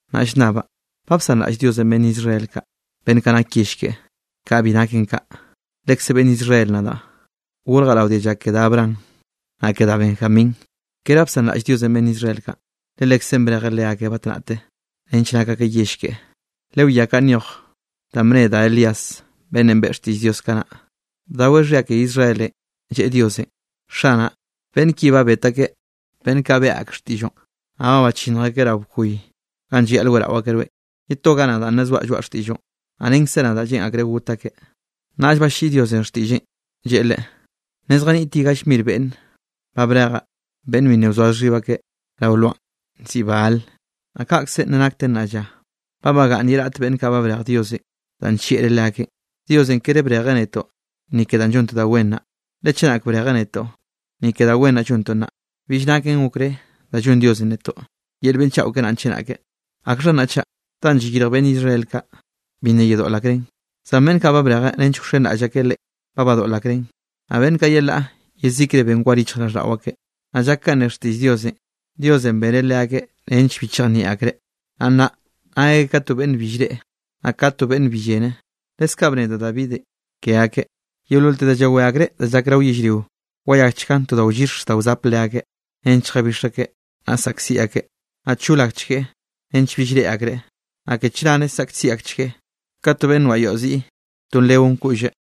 Naꞌ llnnabaꞌ: ¿Ba bsanraꞌll Diosenꞌ beꞌnn Israel kaꞌ, beꞌnn kaꞌ nak yell keꞌe? Kaꞌa bi naken kaꞌ. Lekze beꞌnn Israel nadaꞌ, gorjaꞌ rao dialla ke da Abraham, naꞌ ke da Benjamín. Kere ba bsanraꞌll Diosenꞌ beꞌnn Israel kaꞌ, le Lekzeꞌn brejeꞌ leakeꞌ batnaꞌte nench nak akeꞌ yell keꞌe. Lewiá kanꞌ nyoj danꞌ bne da Elías, beꞌnnenꞌ beꞌe xtiꞌll Diosenꞌ kanaꞌ, bdaweꞌ xhia ke Israelenꞌ, lleꞌe Diosenꞌ: “Xanaꞌ, beꞌnn ki ba bet akeꞌ beꞌnn kaꞌ beꞌe ak xtiꞌlloꞌn, naꞌ ba bachinnj akeꞌ rao bkoy ganꞌ llayaꞌl weꞌrao akeꞌ rweꞌn. Ye toga nadaꞌ nna zoaꞌ llzoaꞌ xtiꞌlloꞌn, naꞌ renkze nadaꞌ, lleꞌn akreꞌ got akeꞌ.” Naꞌll balliꞌi Diosenꞌ xtiꞌlleꞌn, lleꞌe leꞌe: “Nna zjaniꞌt ye gall mir beꞌnne ba brejaꞌ, beꞌnn bi nna wzoa xhib akeꞌ rao lwaꞌn, nziꞌi Baal.” Naꞌ kaꞌkze nna nakten nnaꞌ lla, ba bagaꞌnn ye raꞌt beꞌnn kaꞌ ba brej Diosenꞌ danꞌ nllieꞌreꞌ leakeꞌn. Diosenꞌ kere brejeꞌ netoꞌ, ni ke da llontoꞌ da wen naꞌ. Le chenak brejeꞌ netoꞌ, ni ke da wen naꞌ llontoꞌ naꞌ, bill naken okré da llonn Diosenꞌ netoꞌ yel beꞌnn chaꞌo keꞌe naꞌ chenake. ¿Akxha naꞌ chaꞌ? Danꞌ llayirj beꞌnn Israel kaꞌ, bi nna yedoꞌl akreꞌn; zan beꞌnn kaꞌ ba brejeꞌ nench wxenraꞌll akeꞌ Leꞌen, ba badoꞌl akreꞌn. Naꞌ beꞌnn kaꞌ yelaꞌ yezikre ben war yichjraꞌlldaꞌo akeꞌ. Naꞌ llak kanꞌ ne xtiꞌll Diosenꞌ: “Diosenꞌ beneꞌ leakeꞌ nench bi chejnieꞌ akreꞌ, naꞌ nnaꞌ nak akeꞌ ka to beꞌnn bi llreꞌe, naꞌ ka to beꞌnn bi llene.” Leskaꞌ bne da Davidenꞌ ke akeꞌ: Yeololte da llawé akreꞌ da llak rao yellrionꞌ, wayakchgan to da wllix da wzap leakeꞌ, nench lljabix akeꞌ, naꞌ saꞌkziꞌ akeꞌ. Naꞌ chol akchgueꞌ nench bill reꞌe akreꞌ, naꞌ ke chnare saꞌkziꞌ akchgueꞌ ka to beꞌnn noaꞌ yoaꞌ ziꞌi, to nleon koꞌlleꞌ.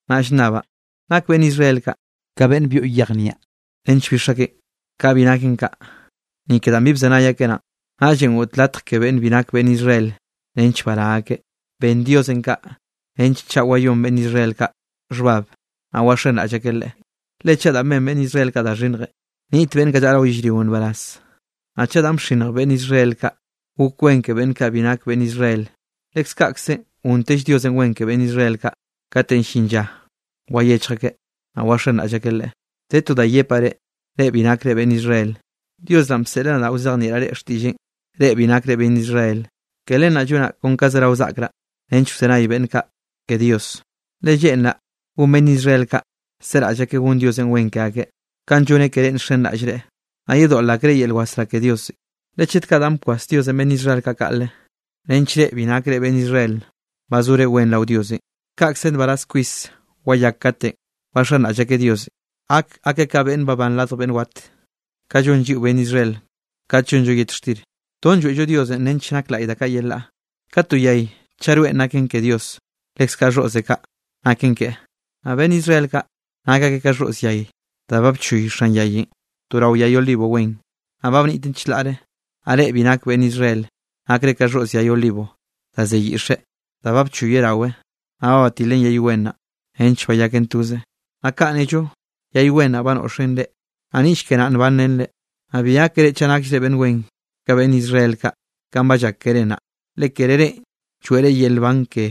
Naꞌ llnnabaꞌ: ¿Nak beꞌnn Israel kaꞌ ka beꞌnne byoꞌ yej niaꞌ nench bix akeꞌn? Kaꞌa bi naken kaꞌ. Ni ke danꞌ bi bzenay akeꞌ naꞌn, naꞌllenꞌ goꞌt latj ke beꞌnn bi nak beꞌnn Israel nench bará akeꞌ. Ben Diosenꞌ kaꞌ nench chaꞌ wayón beꞌnn Israel kaꞌ xhbab, naꞌ waxenraꞌll akeꞌ Leꞌe. Le chaꞌ danꞌ ben beꞌnn Israel kaꞌ da xhinnjenꞌ, niꞌt beꞌnn kaꞌ llaꞌa rao yellrionꞌ nbaraz, naꞌ chaꞌ danꞌ bxinnj beꞌnn Israel kaꞌ, gok wen ke beꞌnn kaꞌ bi nak beꞌnn Israel, leskaꞌkze gontell Diosenꞌ wen ke beꞌnn Israel kaꞌ kate llin lla wayechj akeꞌ, naꞌ waxenraꞌll akeꞌ Leꞌe. De to da yepaꞌ reꞌ, reꞌ bi nakre beꞌnn Israel. Dios naꞌ bseꞌl nadaꞌ wzejnieꞌraꞌ reꞌ xtiꞌlleꞌn, reꞌ bi nakre beꞌnn Israel. Ke len naꞌ llonaꞌ kon ga zerao saꞌkraꞌ nench wzenay beꞌnn kaꞌ ke Diosenꞌ, le lleꞌnraꞌ gon beꞌnn Israel kaꞌ seraꞌll akeꞌ gon Diosenꞌ wen ke akeꞌ, kanꞌ lloneꞌ ke reꞌ nxenraꞌll Leꞌe, naꞌ yedoꞌl akreꞌ yel wasrá ke Diosenꞌ. Le chet kaꞌ danꞌ bkwas Diosenꞌ beꞌnn Israel kaꞌ kaꞌle, nench reꞌ bi nakre beꞌnn Israel bazore wen rao Diosenꞌ, kaꞌkze nbaraz kwis wayak katenꞌ waxenraꞌll akeꞌ Diosenꞌ, gak akeꞌ ka beꞌnn babán radj beꞌnn wat. Ka llon lliꞌo beꞌnn Israel kat llonllo yet xtir, ton lloeꞌllo Diosenꞌ nench nak laꞌy da kaꞌ yelaꞌ. Ka to yay, chaꞌ roenꞌ naken ke Diosenꞌ, leskaꞌ xhoꞌze kaꞌ naken keꞌe. Naꞌ beꞌnn Israel kaꞌ nak akeꞌ ka xhoꞌz yay, da ba nchoy xan yayenꞌ to rao yay olivo wen, naꞌ ba bniꞌten chlaꞌre. Naꞌ reꞌ bi nak beꞌnn Israel nakre ka xhoꞌz yay olivo da ze yiꞌxe, da ba bchoyeꞌ rawe, naꞌ ba batileꞌn yay wen naꞌ, nench bayaken toze. Naꞌ kaꞌn nello yay wen naꞌn ba noꞌxen reꞌ, naꞌ niꞌll ke naꞌ nbanrenre. Naꞌ bi gákere chaꞌ nakllre beꞌnn wen ka beꞌnn Israel kaꞌ, kanꞌ ba llak keré naꞌ. Le kere reꞌn lloeꞌre yel nban ke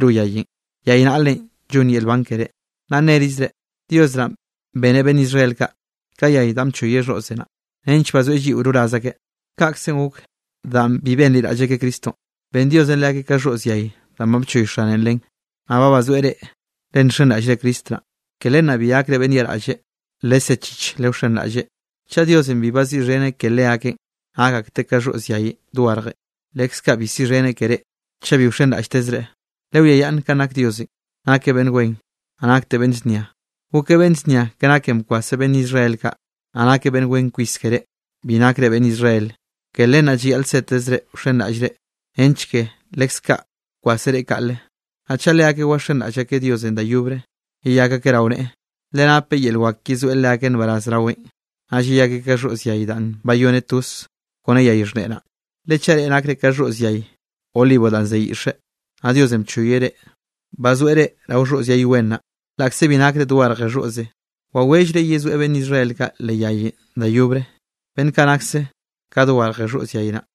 ro yayenꞌ, yay naꞌlenꞌ llonn yel nban ke reꞌ. Naꞌ nerizre: “Dios naꞌ beneꞌ beꞌnn Israel kaꞌ ka yay danꞌ bchoyeꞌ xhoꞌze naꞌ, nench bazoeꞌ lliꞌo roraz akeꞌ.” Kaꞌkzenꞌ gok, danꞌ bi benliraꞌll akeꞌ Cristonꞌ, ben Diosenꞌ leakeꞌ ka xhoꞌz yay danꞌ ba bchoy xane len, naꞌ ba bazoeꞌ reꞌ, le nxenraꞌllre Cristo naꞌ. Ke len naꞌ bi gakre beꞌnn yaꞌraꞌlle, lesechich lewxenraꞌlleꞌ. Chaꞌ Diosenꞌ bi baziꞌxheneꞌ ke leakeꞌn nak akteꞌ ka xhoꞌz yayenꞌ dogarje, leskaꞌ bi siꞌxheneꞌ ke reꞌ chaꞌ bi wxenraꞌlltezre. Lewiayaꞌnn kanꞌ nak Diosenꞌ. Nakeꞌ beꞌnn wen, naꞌ nakteꞌ beꞌnn znia. Gokeꞌ beꞌnn znia ke naken bkwaseꞌ beꞌnn Israel kaꞌ, naꞌ nakeꞌ beꞌnn wen kwis ke reꞌ, bi nakre beꞌnn Israel. Ke len naꞌ llayaꞌl setezre wxenraꞌllre, nench ke leskaꞌ kwaseꞌ reꞌ kaꞌle. Naꞌ chaꞌ leakeꞌ waxenraꞌll akeꞌ Diosenꞌ da yobre, yeyak akeꞌ rao neꞌe, le napeꞌ yel wak yezoeꞌ leakeꞌ nbaraz raweꞌn, naꞌll yeyak akeꞌ ka xhoꞌz yay danꞌ bayoneꞌ toze kone yay xhneꞌe naꞌ. Le chaꞌ reꞌ nakre ka xhoꞌz yay olivonꞌ danꞌ ze yiꞌxe, naꞌ Diosenꞌ bchoyeꞌ reꞌ, bazoeꞌ reꞌ rao xhoꞌz yay wen naꞌ, laꞌkze bi nakre dogarje xhoꞌze, wawellreꞌ yezoeꞌ beꞌnn Israel kaꞌ leꞌ yayenꞌ da yobre, beꞌnn kaꞌ nakse ka dogarje xhoꞌz yay naꞌ.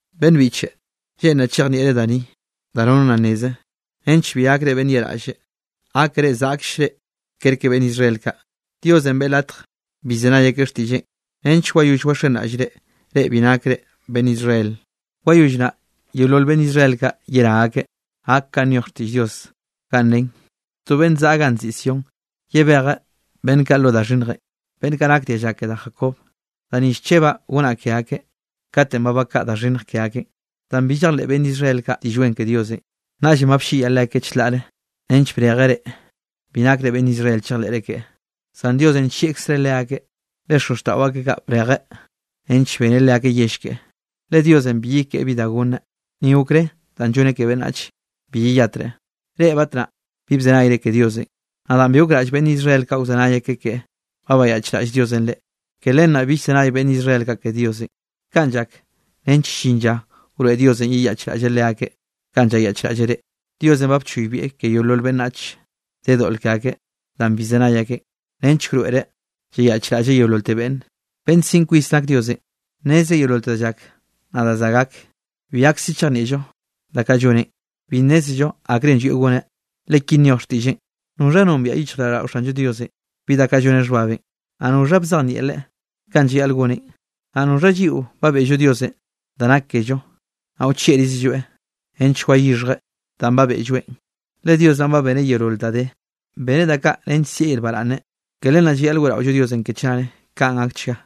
Beꞌnn biꞌche, lleꞌnraꞌ chejnieꞌre da ni da nono nna nneze, nench bi gakre beꞌnn yaꞌraꞌll, gákere zaꞌkllre kerke beꞌnn Israel kaꞌ. Diosenꞌ beꞌe latj bi llzenay akeꞌ xtiꞌlleꞌn nench wayoll waxenraꞌllre, reꞌ bi nakre beꞌnn Israel. Wayoll naꞌ yeolol beꞌnn Israel kaꞌ yerá akeꞌ. Gak kanꞌ nyoj xtiꞌll Diosenꞌ ganꞌ nen: To beꞌnn zaꞌa ganꞌ nziꞌi Sión, yebejeꞌ beꞌnn kaꞌ lo da xhinnjenꞌ, beꞌnn kaꞌ nak dialla ke da Jacob. Da ni llchebaꞌ gonaꞌ ke akeꞌ, katenꞌ ba bakaꞌa da xhinnj ke akeꞌn. Danꞌ bi llejleꞌ beꞌnn Israel kaꞌ Diꞌll Wen ke Diosenꞌ, naꞌllenꞌ ba blliꞌyeꞌ leakeꞌ chlaꞌre nench brejeꞌ reꞌ, bi nakre beꞌnn Israel chejleꞌre keꞌe. Zan Diosenꞌ nllieꞌkzreꞌ leakeꞌ, le xozxtaꞌo akeꞌ kaꞌ, brejeꞌ nench beneꞌ leakeꞌ yell keꞌe. Le Diosenꞌ bi yekeꞌe bi da gonneꞌ, ni okré danꞌ lloneꞌ ke beꞌnnach bi yeyatreꞌn. Reꞌ batnaꞌ bi bzenayre ke Diosenꞌ, naꞌ danꞌ bi gokraꞌll beꞌnn Israel kaꞌ wzenay akeꞌ keꞌe, ba bayaꞌchraꞌll Diosenꞌ reꞌ. Ke len naꞌ bi llzenay beꞌnn Israel kaꞌ ke Diosenꞌ. Kaꞌn llak nench llin lla wroeꞌ Diosenꞌ yeyaꞌchraꞌlleꞌ leakeꞌ kanꞌ llayaꞌchraꞌlleꞌ reꞌ. Diosenꞌ ba bchoybieꞌ ke yeolol beꞌnnach de doꞌl ke akeꞌ danꞌ bi llzenay akeꞌn, nench wroeꞌreꞌ yeyaꞌchraꞌlleꞌ yeololte beꞌnne. Beꞌnn siꞌn kwis nak Diosenꞌ, nnezreꞌ yeololte da llak naꞌ da za gak. Bi gakse chejnieꞌllo da kaꞌ lloneꞌn, bi nnézello akrenꞌ llwieꞌ goneꞌ. Le ki nyoj xtiꞌlleꞌn: “¿Noxha nombiaꞌ yichjraꞌlldaꞌo Xanllo Diosenꞌ bi danꞌ lloneꞌ xhbabenꞌ? Naꞌ ¿noxha bzejnieꞌ Leꞌe kanꞌ llayaꞌl goneꞌn? Naꞌ ¿noxha lliꞌo ba beꞌllo Diosenꞌ da nak kello, naꞌ wchieꞌrizelloeꞌ nench wayixhjeꞌ danꞌ ba beꞌlloeꞌn?” Le Dios naꞌn ba beneꞌ yeolol da de, beneꞌ da kaꞌ nench sieꞌ yel baraꞌnne. Ke len naꞌ llayaꞌl weꞌraollo Diosenꞌ ke chnare. Kaꞌn gakchga.